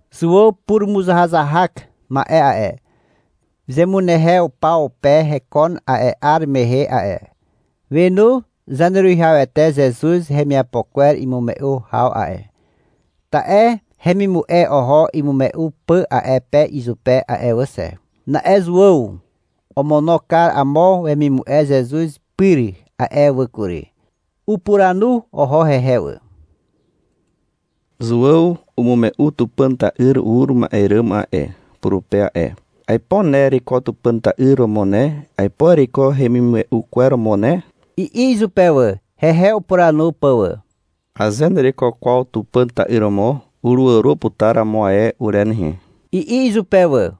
Zuàw purumuzahazahak ma'e a'e, zemunehew paw pe hekon a'e 'ar mehe a'e. Wenu Zaneruwihawete Zezuz hemiapo kwer imume'u haw a'e, (ta'e hemimu'e oho imume'u pà a'e pe izupe a'e wà xe.) Na'e Zuàw omono kar amo wemimu'e Zezuz pyr a'e wà kury. Upuranu oho hehe wà. — Zuàw umume'u Tupàn ta'yr ur ma'e ràm a'e, purupe a'e. Aipo ne ereiko Tupàn ta'yr romo ne, aipo ereiko hemimume'u kwer romo ne, i'i izupe wà, hehe upuranu pà wà. — Aze nereiko kwaw Tupàn ta'yr romo, uruàro putar amo ae ure nehe, i'i izupe wà.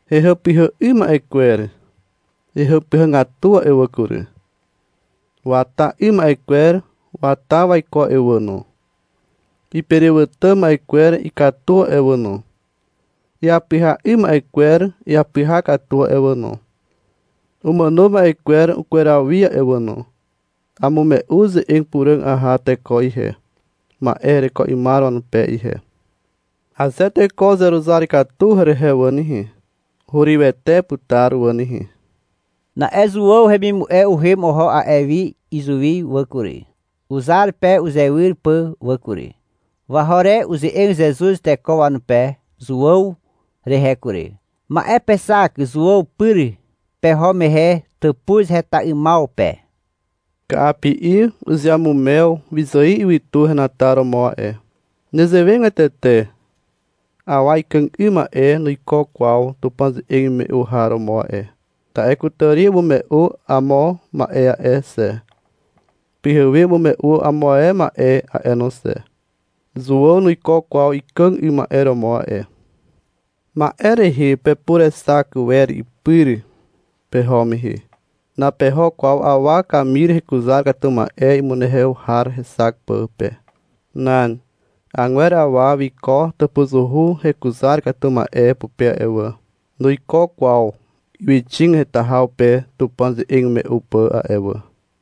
Hehàpyhà 'ym ma'e kwer hehàpyhàgatu a'e wà kury. Wata 'ym ma'e kwer wata waiko a'e wà no. Iperewàtà ma'e kwer ikatu a'e wà no. Iapyha 'ym ma'e kwer iapyha katu a'e wà no. Umàno ma'e kwer ukweraw wi a'e wà no. Amume'u ze'eg puràg aha teko ihe, ma'e hereko 'ymar wanupe ihe. Aze teko uzeruzar katu herehe wà nehe, hurywete putar wà nehe. Na'e Zuàw hemimu'e uhem oho a'e wi izuwi wà kury, uzar pe uzewyr pà wà kury. Waho re uze'eg Zezuz teko wanupe Zuàw rehe kury. — Ma'e pexak Zuàw pyr peho mehe tàpuz heta 'ymaw pe. Ka'api'i uzeamumew wyzài ywytu henataromo a'e. (Nezewegatete awa ikàg 'ym ma'e nuiko kwaw Tupàn ze'eg imume'u har romo a'e. Ta'e kutàri umume'u amo ma'e a'e xe, pyhewe umume'u amo ae ma'e a'e no xe. Zuàw nuiko kwaw ikàg 'ym ma'e romo a'e.) Ma'e rehe pepurexak wer ipyr peho mehe. Napeho kwaw awa kamir hekuzar katu ma'e imunehew har hexak pà pe. Nan. Agwer awa wiko tàpuzuhu hekuzar katu ma'e pupe a'e wà. Nuiko kwaw ywyxig heta haw pe Tupàn ze'eg imume'u pà a'e wà.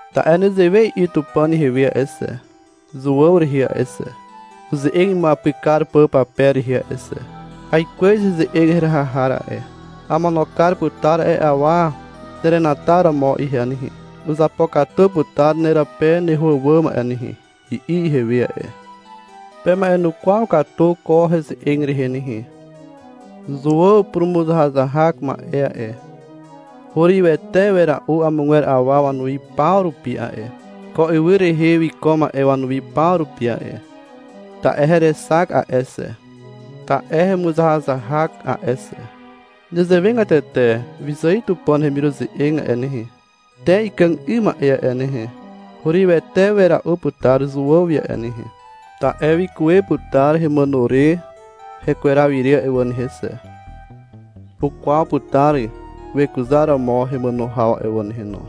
Ta'e nezewe i'i Tupàn ihewe a'e xe, Zuàw rehe a'e xe, uze'eg imuapyk kar pà pape rehe a'e xe. Aikwez heze'eg heraha har a'e. Amono kar putar a'e awa nerenataromo ihe nehe. Uzapokatu putar nerape neho àwàm a'e nehe, I'i ihewe a'e. Pema'enukwaw katu ko heze'eg rehe nehe. Zuàw purumuzahazahak ma'e a'e, hurywete wera'u amogwer awa wanuwi paw rupi a'e, ko ywy rehe wiko ma'e wanuwi paw rupi a'e (ta'e herexak a'e xe, ta'e hemuzahazahak a'e xe). Nezewegatete wyzài Tupàn hemiruze'eg a'e nehe, te ikàg 'ym ma'e a'e nehe, hurywete wera'u putar Zuàw wi a'e nehe (ta'e wikuwe putar hemàno re hekweraw ire a'e wà nehe xe. Ukwaw putar wekuzaromo hemàno haw a'e wà nehe no).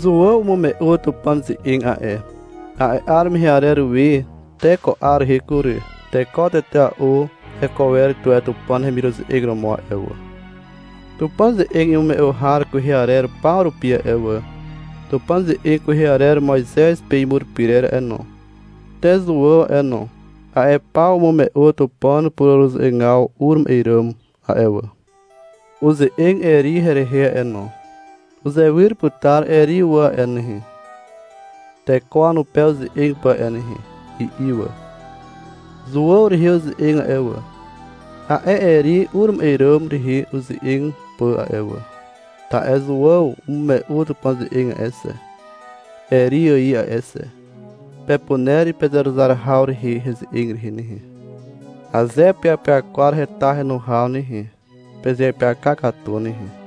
Zuàw umume'u Tupàn ze'eg a'e. A'e 'ar mehe arer we te ko 'ar rehe kury, teko tetea'u heko wer tuwe Tupàn hemiruze'eg romo a'e wà. Tupàn ze'eg imume'u har kwehe arer paw rupi a'e wà, Tupàn ze'eg kwehe arer Moizez pe imur pyrer a'e no, te Zuàw a'e no, a'e paw umume'u Tupàn pureruze'egaw ur ma'e ràm a'e wà. Uze'eg Eri herehe a'e wà no. — Uzewyr putar Eri wà a'e nehe, teko wanupe uze'eg pà a'e nehe, i'i wà. Zuàw rehe uze'eg a'e wà, a'e Eri ur ma'e ràm rehe uze'eg pà a'e wà. (Ta'e Zuàw umume'u Tupàn ze'eg a'e xe, Eri ài a'e xe.) Pepuner pezeruzar haw rehe heze'eg rehe nehe. Aze peapyakwar heta henu haw nehe, pezeapyaka katu nehe.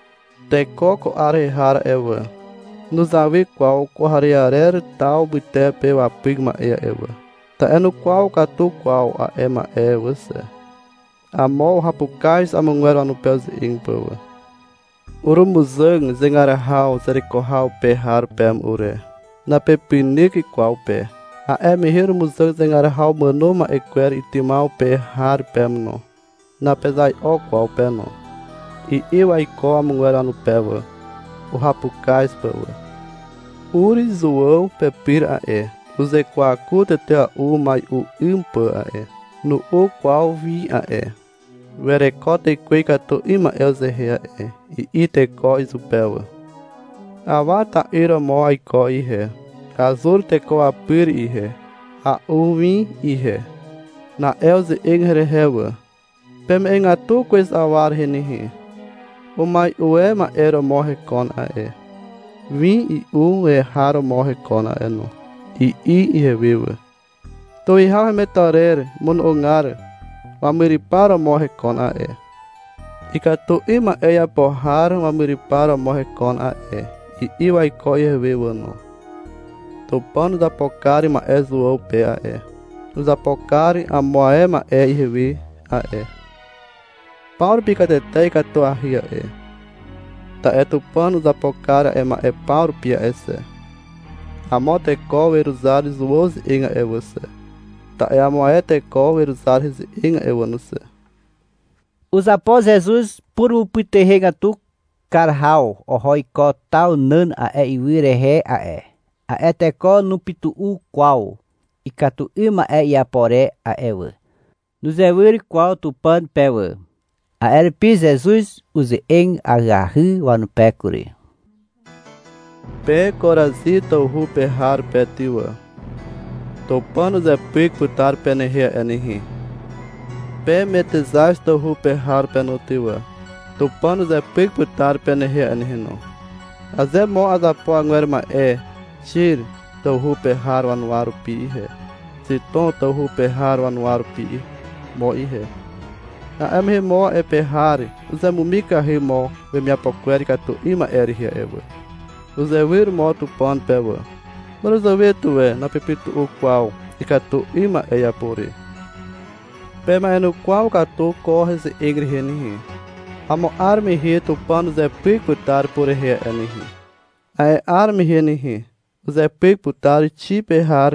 Teko ko 'ar rehe har a'e wà, nuzawy kwaw kwarearer taw mytepe wapyk ma'e a'e wà (ta'e nukwaw katu kwaw ma'e a'e wà xe). Amo uhapukaz amogwer wanupe uze'eg pà wà. — Urumuzàg zegar haw zereko haw pe har peme ure. Napepynyk kwaw pe. A'e mehe urumuzàg zegar haw umàno ma'e kwer itymaw pe har peme no. Napezai'o kwaw pe no, (i'i waiko amogwer wanupe wà, uhapukaz pà wà.) Ur Zuàw pepyr a'e. Uzekwaku tetea'u umai'u 'ym pà a'e. Nu'u kwaw win a'e. — Wereko tekwe ikatu 'ym ma'e uzehe a'e, i'i teko izupe wà. Awa ta'yr romo aiko ihe. Azur teko wapyr ihe. A'u win ihe. Na'e uze'eg herehe wà. — Peme'egatu kwez awa rehe nehe, umai'u e ma'e romo hekon a'e, win i'u e har romo hekon a'e no, i'i ihewe wà. — Tuwihaw hemetarer mono'ogar wamyrypar romo hekon a'e. Ikatu 'ym ma'e iapo har wamyrypar romo hekon a'e, i'i waiko ihewe wà no. Tupàn uzapo kar ma'e Zuàw pe a'e. Uzapo kar amo ae ma'e ihewe a'e. Paw rupi katete ikatuahy a'e, ta'e Tupàn uzapo kar a'e ma'e paw rupi a'e xe, amo teko weruzar Zuàw ze'eg a'e wà xe, ta'e amo ae teko weruzar heze'eg a'e wà no xe. Uzapo Zezuz purumupytuhegatu kar haw oho iko taw nàn a'e ywy rehe a'e. A'e teko nupytu'u kwaw ikatu 'ym ma'e iapo re a'e wà. Nuzewyr kwaw Tupàn pe wà. A'e rupi Zezuz uze'eg ahyahy wanupe kury. — Pe Korazi tawhu pe har pe ty wà. Tupàn uzepyk putar penehe a'e nehe. Pe Metexaz tawhu pe har pe no ty wà. Tupàn uzepyk putar penehe a'e nehe no. Aze mo azapo agwer ma'e Xir tawhu pe har wanuwa rupi ihe, Xitom tawhu pe har wanuwa rupi mo ihe, a'e mehe mo a'e pe har uzemumikahy mo wemiapo kwer ikatu 'ym ma'e rehe a'e wà. Uzewyr mo Tupàn pe wà. (Màràzàwe tuwe napepytu'u kwaw ikatu 'ym ma'e iapo re.) Pema'enukwaw katu ko heze'eg rehe nehe. Amo 'ar mehe Tupàn uzepyk putar purehe a'e nehe. A'e 'ar mehe nehe, uzepyk putar Xir pe har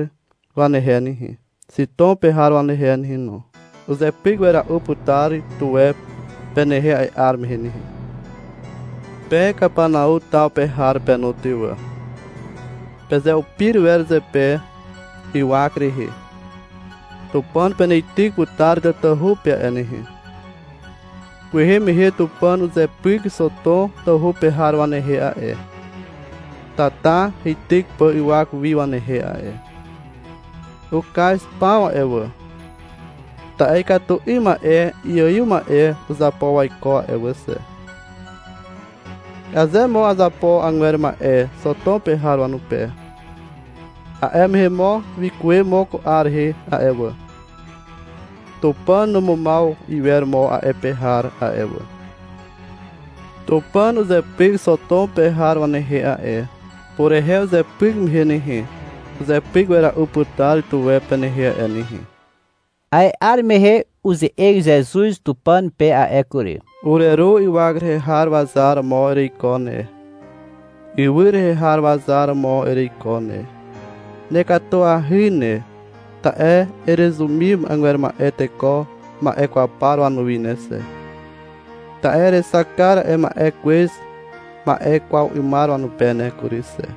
wanehe nehe, Xitom pe har wanehe nehe no. Uzepyk wera'u putar tuwe penehe a'e 'ar mehe nehe. Pe Kapanau taw pe har pe no ty wà. Pezeupir wer zepe ywak rehe. Tupàn peneityk putar tatahu pe a'e nehe. (Kwehe mehe Tupàn uzepyk Xotom tawhu pe har wanehe a'e, tata heityk pà ywak wi wanehe a'e. Ukaz paw a'e wà, ta'e ikatu 'ym ma'e iaiw ma'e uzapo waiko a'e wà xe. Aze mo azapo agwer ma'e Xotom pe har wanupe, a'e mehe mo wikuwe mo ko 'ar rehe a'e wà. Tupàn numumaw iwer mo a'e pe har a'e wà.) Tupàn uzepyk Xotom pe har wanehe a'e. Purehe uzepyk mehe nehe, uzepyk wera'u putar tuwe penehe a'e nehe. A'e 'ar mehe uze'eg Zezuz Tupàn pe a'e kury. — Ureru ywak rehe har wazar romo ereiko ne, ywy rehe har wazar romo ereiko ne. Nekatuahy ne, ta'e erezumim agwer ma'e teko ma'e kwaw par wanuwi ne xe. Ta'e erexak kar a'e ma'e kwez ma'e kwaw 'ymar wanupe ne kury xe.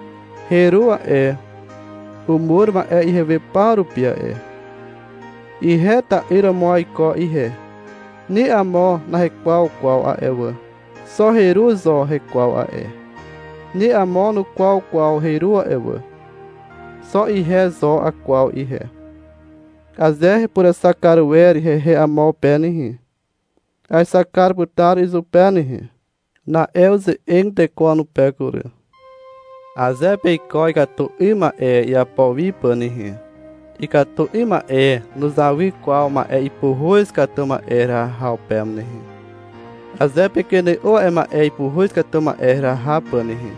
— Heru a'e. Umur ma'e ihewe paw rupi a'e. Ihe ta'yr romo aiko ihe. Ni amo nahekwaw kwaw a'e wà. Xo heru zo hekwaw a'e. Ni amo nukwaw kwaw heru a'e wà. Xo ihe zo akwaw ihe. Aze hepurexak kar wer hehe amo pe nehe, aexak kar putar izupe nehe. Na'e uze'eg teko wanupe kury. — Aze peiko ikatu 'ym ma'e iapo wi pà nehe, ikatu 'ym ma'e nuzawy kwaw ma'e ipuhuz katu ma'e heraha haw peme nehe. Aze pekene'o a'e ma'e ipuhuz katu ma'e heraha pà nehe,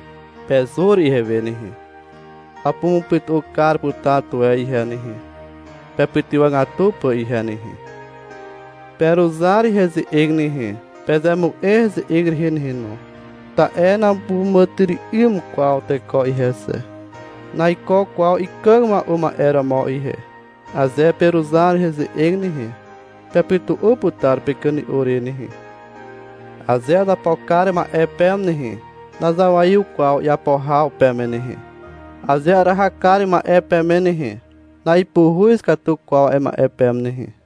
pezur ihewe nehe, apumupytu'u kar putar tuwe ihe nehe (pepytywàgatu pà ihe nehe). Peruzar heze'eg nehe. Pezemu'e heze'eg rehe nehe no. Ta'e napuràmàtyry'ym kwaw teko ihe xe. Naiko kwaw ikàg mua'u ma'e romo ihe. Aze peruzar heze'eg nehe, pepytu'u putar pekene'o re nehe. Aze azapo kar ma'e peme nehe, nazawaiw kwaw iapo haw peme nehe. Aze araha kar ma'e peme nehe, na'ipuhuz katu kwaw a'e ma'e peme nehe.